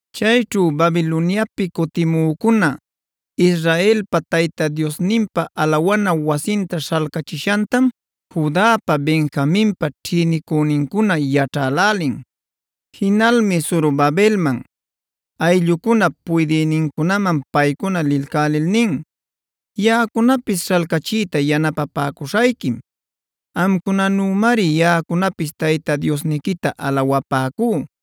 Chayćhu Babiloniapi cutimücuna Israelpa Tayta Diosninpa alawana wasinta śhalcachishantam Judapa Benjaminpa ćhïnicünincuna yaćhälälin. Jinalmi Zorobabelman, ayllucunap puydïnincunaman paycuna lilcälil nin: “Yaꞌacunapis śhalcachiyta yanapapäcuśhayquim. Amcunanümari yaꞌacunapis Tayta Diosniquita alawapäcú.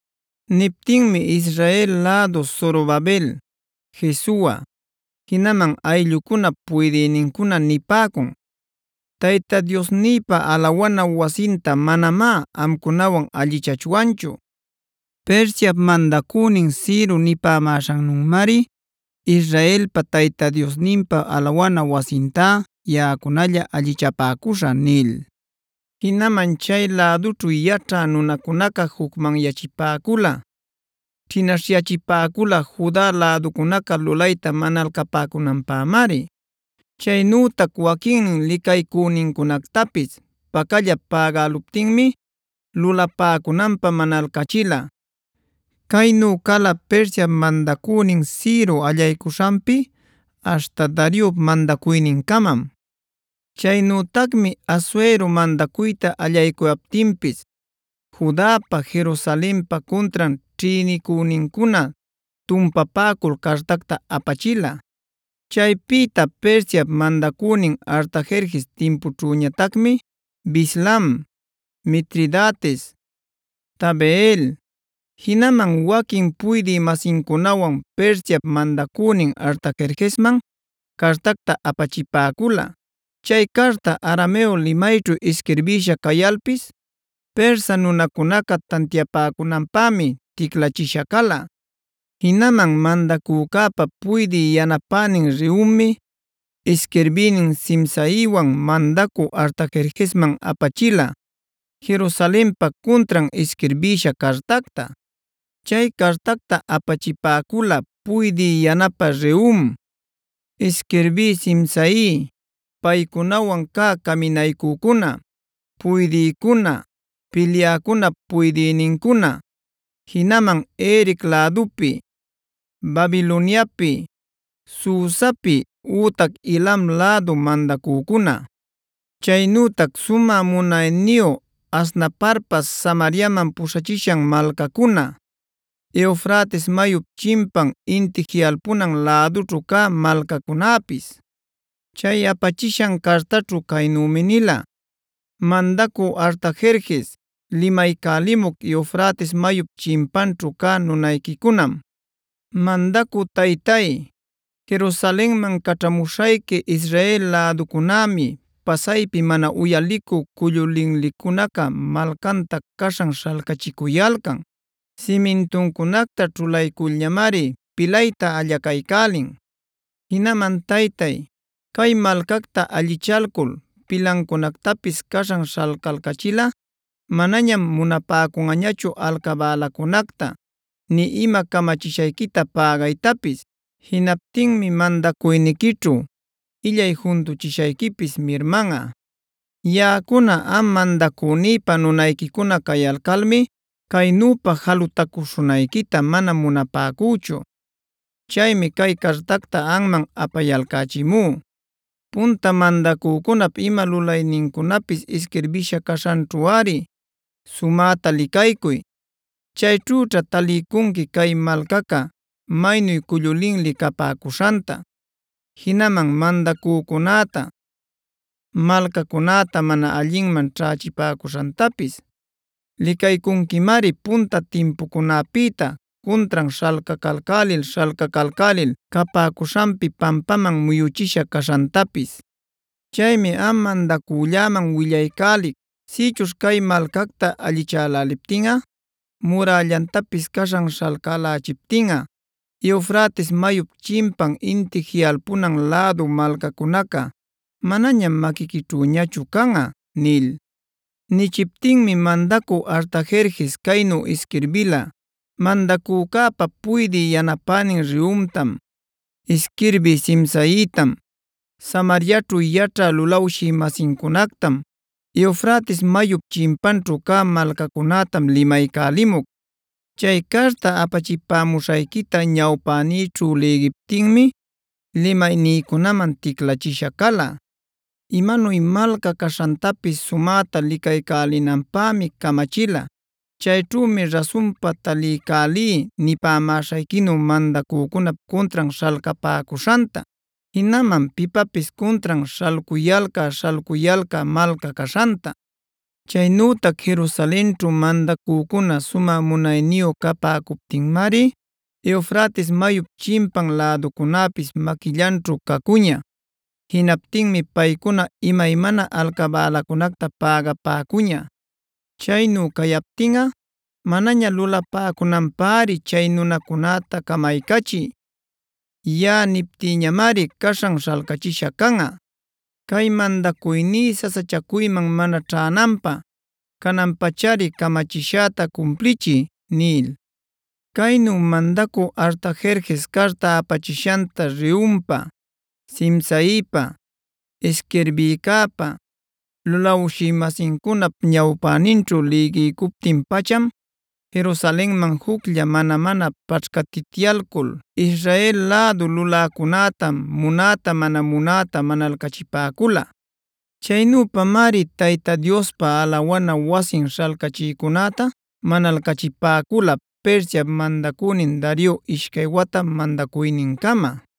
Niptinmi Israel lädu Zorobabel, Jesua, jinaman ayllucunap puydïnincuna nipäcun: “Tayta Diosnïpa alawana wasinta manamá amcunawan allichachwanchu. Persiap mandacünin Ciro nipämäśhannümari Israelpa Tayta Diosninpa alawana wasintá yaꞌacunalla allichapäcuśhä” nil. Jinaman chay lädućhu yaćhä nunacunaca jucmanyachipäcula, ćhinaśhyachipäcula Juda läducunaca lulayta manalcapäcunanpämari. Chaynütac waquinnin licaycünincunactapis pacallap pägäluptinmi lulapäcunanpä manalcachila. Caynu cala Persiap mandacünin Ciro allaycuśhanpi aśhta Dariop mandacuynincamam. Chaynütacmi Asuerob mandacuyta allaycuyaptinpis Judapa Jerusalenpa cuntran ćhïnicünincuna tumpapäcul cartacta apachila. Chaypïta Persiap mandacünin Artajerjesc timpućhüñatacmi Bislam, Mitridates, Tabeel, jinaman waquin puydï-masincunawan Persiap mandacünin Artajerjesman cartacta apachipäcula. Chay carta arameo limayćhu isquirbisha cayalpis Persa nunacunaca tantiapäcunanpämi ticlachisha cala. Jinaman mandacücäpa puydï yanapänin Rehummi, isquirbïnin Simsaiwan mandacü Artajerjesman apachila Jerusalenpa cuntran isquirbïsha cartacta. Chay cartacta apachipäcula puydï yanapä Rehum, isquirbï Simsai, paycunawan cä caminaycücuna, puydïcuna, pilyäcunap puydïnincuna, jinaman Erec lädupi, Babiloniapi, Susapi ütac Elam lädu mandacücuna, chaynütac sumä munayniyu Asnaparpa Samariaman puśhachishan malcacuna, Eufrates mayup chimpan inti jiꞌalpunan lädućhu cä malcacunäpis. Chay apachishan cartaćhu caynümi nila: “Mandacü Artajerjes, limaycälimuc Eufrates mayup chimpanćhu cä nunayquicunam. Mandacü taytay, Jerusalenman caćhamuśhayqui Israel läducunämi pasaypi mana uyalicü cullu linlicunaca malcanta caśhan śhalcachicuyalcan. Simintuncunacta ćhulayculñamari pilayta allacaycälin. Jinaman Taytay, cay malcacta allichalcul pilancunactapis caśhan śhalcalcachilꞌa manañam munapäcunꞌañachu alcabälacunacta, nï ima camachishayquita pägaytapis. Jinaptinmi mandacuyniquićhu illay juntuchishayquipis mirmanꞌa. Yaꞌacuna am mandacünïpa nunayquicuna cayalcalmi caynüpa jalutacuśhunayquita mana munapäcüchu. Chaymi cay cartacta anman apayalcächimú. Punta mandacücunap ima lulaynincunapis isquirbisha caśhanćhuꞌari sumäta licaycuy. Chayćhüćha taliycunqui cay malcaca maynu cullu linli capäcuśhanta, jinaman mandacücunäta, malcacunäta mana allinman ćhächipäcushantapis. Licaycunquimari punta timpucunapïta cuntran śhalcalcälil-śhalcalcälil capäcuśhanpi pampaman muyuchisha caśhantapis. Chaymi am mandacülläman willaycälic, sïchuśh cay malcacta allichäläliptinꞌa murällantapis caśhan śhalcälächiptinꞌa Eufrates mayup chimpan inti jiꞌalpunan lädu malcacunaca manañam maquiquićhüñachu canꞌa” nil. Nichiptinmi mandacü Artajerjes caynu isquirbila: “Mandacücäpa puydï yanapänin Rehumtam, isquirbï Simsaitam, Samariaćhu yaćhä lulawshï-masincunactam, Eufrates mayup chimpanćhu cä malcacunätam limaycälimuc. Chay carta apachipämuśhayquita ñawpänïćhu lïgiptinmi limaynïcunaman ticlachisha cala. Imanuy malca caśhantapis sumäta licaycälinanpämi camachilá. Chayćhümi rasunpa taliycälí nipämäśhayquinu mandacücunap cuntran śhalcapäcuśhanta, jinaman pipapis cuntran śhalcuyalcä-śhalcuyalcä malca caśhanta. Chaynütac Jerusalenćhu mandacücuna sumä munayniyu capäcuptinmari Eufrates mayup chimpan läducunäpis maquillanćhu cacuña. Jinaptinmi paycuna imaymana alcabälacunacta pägapäcuña. Chaynu cayaptinꞌa manaña lulapäcunanpäri chay nunacunäta camaycachiy. Yaꞌa niptïñamari caśhan śhalcachisha canꞌa. Cay mandacuyní sasachacuyman mana ćhänanpä canan-pachari camachishäta cumplichiy” nil. Caynu mandacü Artajerjes carta apachishanta Rehumpa, Simsaipa, isquirbïcäpa, lulawshï-masincunap ñawpäninćhu lïgiycuptin-pacham Jerusalenman juclla mana-mana paćhcatityalcul Israel lädu luläcunäta munäta-mana munäta manalcachipäcula. Chaynüpamari Tayta Diospa alawana wasin śhalcachïcunäta manalcachipäcula Persiap mandacünin Dario ishcay wata mandacuynincama.